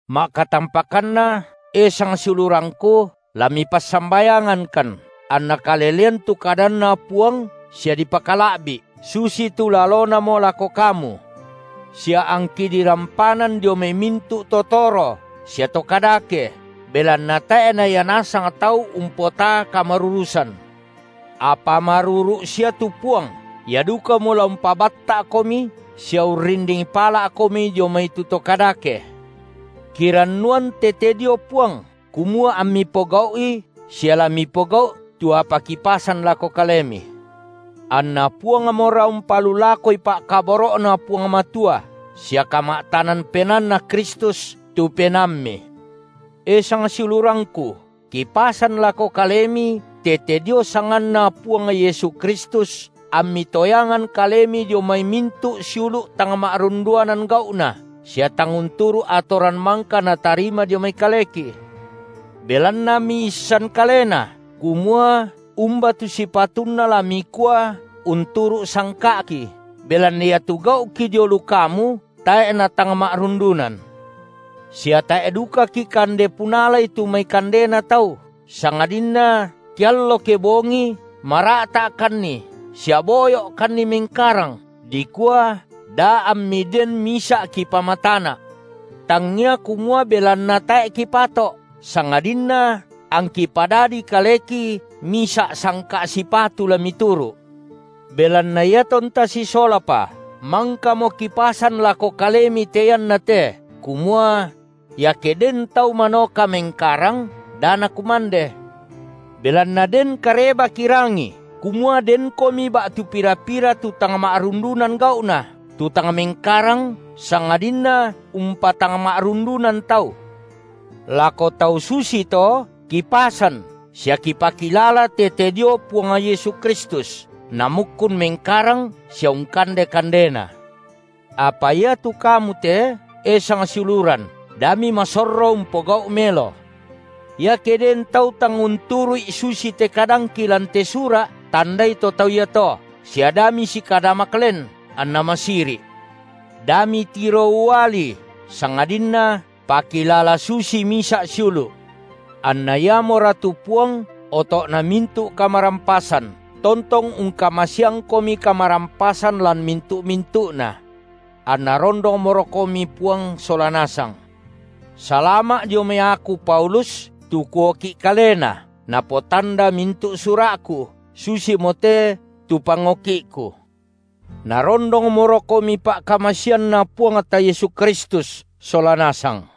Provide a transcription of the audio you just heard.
Ma’katampakanna, e sang siulurangku, lamipassambayangankan, anna kalelean tu kadanNa Puang sia dipakala’bi’, susitu lalonamo lako kamu, sia angki dirampanan dio mai mintu’ to toro sia to kadake, belanna tae’ na ia nasang tau umpotaa kamarurusan. Apa maruru’ sia tu Puang, Ia dukamo la umpabatta’komi sia urrinding pala’komi dio mai tu to kadake. Kirannuan tete dio Puang, kumua ammi pogau’i, sia la mipogau’ tu apa kipasan lako kalemi. Anna Puangmora umpalulakoi pa’kaboro’Na Puang Matua sia kama’tanan penaanNa Kristus tu penaammi. E sangsiulurangku, kipasan lako kalemi tete dio sanganNa Puang Yesu Kristus, ammi toyangan kalemi dio mai mintu’ siulu’ tang ma’rundunan gau’na, sia tang unturu’ atoran mangka natarima dio mai kaleki. Belanna miisan kalena, kumua umba tu sipatunna la mikua unturu’ sangka’ki, belanna iatu gau’ki dio lu kamu tae’ natang ma’rundunan; sia tae’ duka kikande punalai tu mai kandena tau, sangadinna keallo kebongi mara’ta’kanni sia boyo’kanni mengkarang dikua da ammi den misa’ kipamatana’. Tangia kumua belanna tae’ kipato’, sangadinna angki padadi kaleki misa’ sangka’ sipatu la mituru’. Belanna iatonta sisolapa, mangkamo kipasan lako kalemi te ianna te, kumua: iake den tau manoka mengkarang, da nakumande. Belanna den kareba kirangi kumua denkomi ba’tu pira-pira tu tang ma’rundunan gau’na, tu tang mengkarang sangadinna umpatangma’rundunan tau. Lako tau susito kipasan sia kipakilala tete dio Puang Yesu Kristus, namukkun mengkarang sia ungkande kandena. Apa iatu kamu te, e sangsiuluran, da mimasorro umpogau’ melo. Iake den tau tang unturu’i susite kadangki lan te sura’ tandai to tau iato, sia da misikadamak len, anna masiri’. Da mitiro ualii, sangadinna pakilala susii misa’ siulu’. Anna Iamora tu Puang, oto’na mintu’ kamarampasan, tontong ungkamaseangkomi kamarampasan lan mintu’-mintu’na. Anna rondongmorokomi Puang sola nasang. Salama’ dio mai aku Paulus, tu kuoki’ kalena, napotanda mintu’ sura’ku, susimote tu pangoki’ku. Narondongmorokomi pa’kamaseanNa Puangta Yesu Kristus sola nasang.